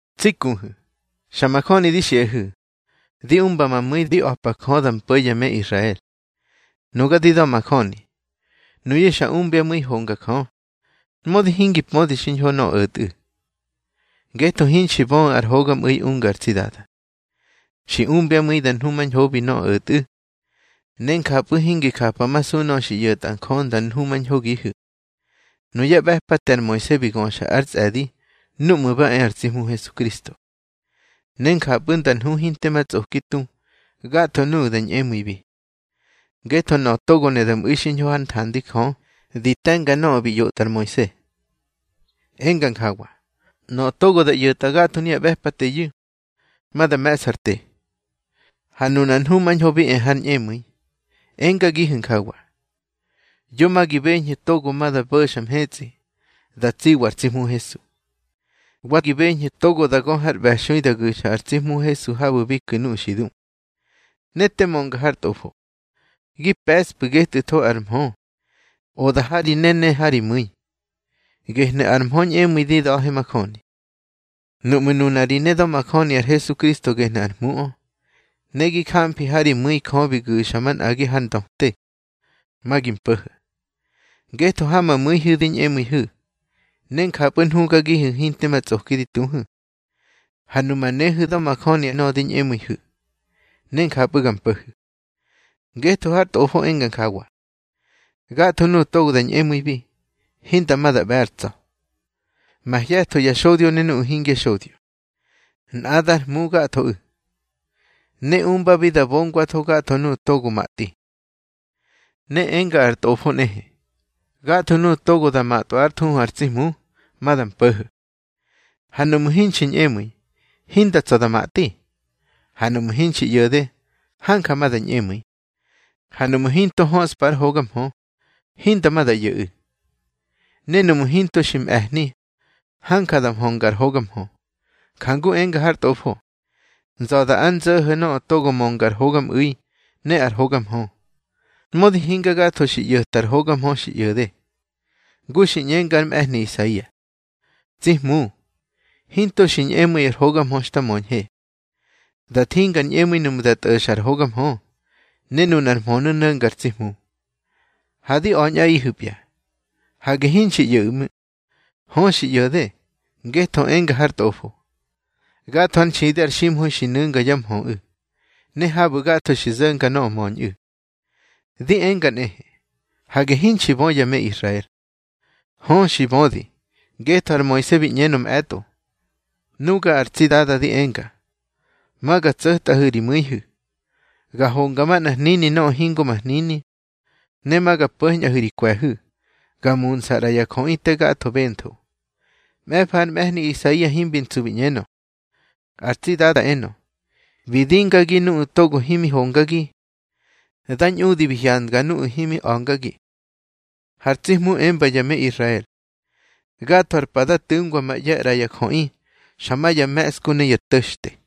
Tsi kuhu̱, xa majöni di xiꞌahu̱, di umba ma mu̱i di a̱pa Jö da mpo̱ ya me Israel. Nuga di da̱majöni, nuyu̱ xa umbyá mu̱i honga Jö, mödi hingi pödi xiñho nöꞌö o̱tꞌu̱. Ngetho hinxi böꞌu̱ ar hogamꞌu̱i ungar tsi Dada. Xi umbyá mu̱i da nhumañhobi nöꞌö o̱tꞌu̱, ne njapꞌu̱ hingi japamasu nöꞌö xi ꞌyo̱tꞌa Jö nda nhumañhogihu̱. Nuyá ꞌbe̱pate ar Moise bi göxa ár tsꞌe̱di núꞌmu̱ ba e ar tsi Hmu Hesukristo, ne njapꞌu̱ nda nhu hinte ma tsꞌoki tu gatho nuꞌu̱ da ñꞌemu̱ibi. Ngetho nöꞌö togo ne da mꞌu̱i xiñho hár nthandi Jö di te̱nga nöꞌö bi ꞌyotꞌa ar Moise, enga njawa: Nöꞌö togo da ꞌyo̱tꞌa gatho nuya ꞌbe̱pateyu̱, ma da me̱ꞌsa ar te. Ha nunar nhumañho bi e har ñꞌemu̱i, engagihu̱ njawa: Yo ma gi beñhu̱ togo ma da bo̱xa mhetsꞌi da tsiwa ar tsi Hmu Hesu. Wa gi ꞌñeñhu̱: Togo da gö har ꞌbe̱xui da gu̱xa ar tsi Hmu Hesu habu̱ bi ku̱ nuꞌu̱ xi du. Ne te mönga har Tꞌofo: Gi pe̱ꞌspꞌu̱ getꞌu̱tho ar mhö, oda ha ri ne, ne ha ri mu̱i. Gehnu̱ ar mhö ñꞌemu̱i di da̱he majöni. Nuꞌmu̱ nuna ri ne da̱majöni ar Hesukristo gehnu̱ ar Hmuꞌö, ne gi jamfi ha ri mu̱i Jö bi gu̱xa manꞌagi har ndöte, ma gi mpo̱ho̱. Ngetho ha ma mu̱ihu̱ di ñꞌemu̱ihu̱, ne njapꞌu̱ nhugagihu̱ hinte ma tsꞌoki di tuhu̱. Ha numa nehu̱ da̱majöni nöꞌö di ñꞌemu̱ihu̱, ne njapꞌu̱ ga mpo̱hu̱. Ngetho har Tꞌofo enga njawa: Gatho nuꞌu̱ togo da ñꞌemu̱ibi, hinda ma da ꞌbe̱ ár tsa̱. Mahye̱tho ya xodyo ne nuꞌu̱ hingya xodyo, nꞌadár Hmu gathoꞌu̱, ne umbabi da bongwatho gatho nuꞌu̱ togo matꞌi. Ne enga ar Tꞌofo nꞌehe: Gatho nuꞌu̱ togo da matꞌwa ár thuhu ar tsi Hmu, ma da mpo̱ho̱. Ha nuꞌmu̱ hinxi ñꞌemu̱i, hinda tsa̱ da matꞌi. Ha nuꞌmu̱ hinxi ꞌyo̱de, hanja ma da ñꞌemu̱i. Ha nuꞌmu̱ hinto höꞌspa ar hoga mhö, hinda ma da ꞌyo̱ꞌu̱. Ne nuꞌmu̱ hinto xi mꞌe̱hni, hanja da mhönga ar hoga mhö. Jangu enga har Tꞌofo: Nza̱da ár nzo̱ho̱ nöꞌö togo mönga ar hogamꞌu̱i ne ar hoga mhö. Mödi hinga gatho xi ꞌyo̱ta ar hoga mhö xi ꞌyo̱de. Ngu xi ꞌñenga ar mꞌe̱hni Isaia: Tsi Hmu, hinto xi ñꞌemu̱i ar hoga mhö xta möñhe. Da thinga ar ñꞌemu̱i nuꞌmu̱ da tꞌo̱xa ar hoga mhö, ne nunar mhönu̱ no̱nga ar tsi Hmu. Ha di a̱ñꞌaꞌihu̱pya: Hage hinxi ꞌyo̱ꞌu̱ ꞌmu̱. Hö, xi ꞌyo̱de, ngetho enga har Tꞌofo: Gatho ár nxidi ar ximha̱i xi nu̱nga yá mhöꞌu̱, ne habu̱ gatho xi zo̱nga nöꞌö möñꞌu̱. Di enga nꞌehe: Hage hinxi bö ya me Israel. Hö, xi bödi, ngetho ar Moise bi ꞌñenö mꞌe̱tꞌo: Nuga ar tsi Dada di enga: Ma ga tso̱tꞌahu̱ ri mu̱ihu̱, ga honga manꞌar hnini nöꞌö hingo ma hnini. Ne ma ga po̱ñꞌahu̱ ri kwe̱hu̱, ga muntsꞌa ꞌra ya jöꞌi te gatho bentho. Mꞌe̱fa ar mꞌe̱hni Isaia himbi ntsu bi ꞌñenö: Ar tsi Dada enö: Bi dingagi nuꞌu̱ togo himi hongagi. Da ñꞌudi bi hyandga nuꞌu̱ himi a̱ngagi. Har tsi Hmu emba ya me Israel: Gatho ar pa da tu̱ngwa ma ꞌye̱ ꞌra ya jöꞌi xa ya me̱ꞌsku ne ya to̱xte.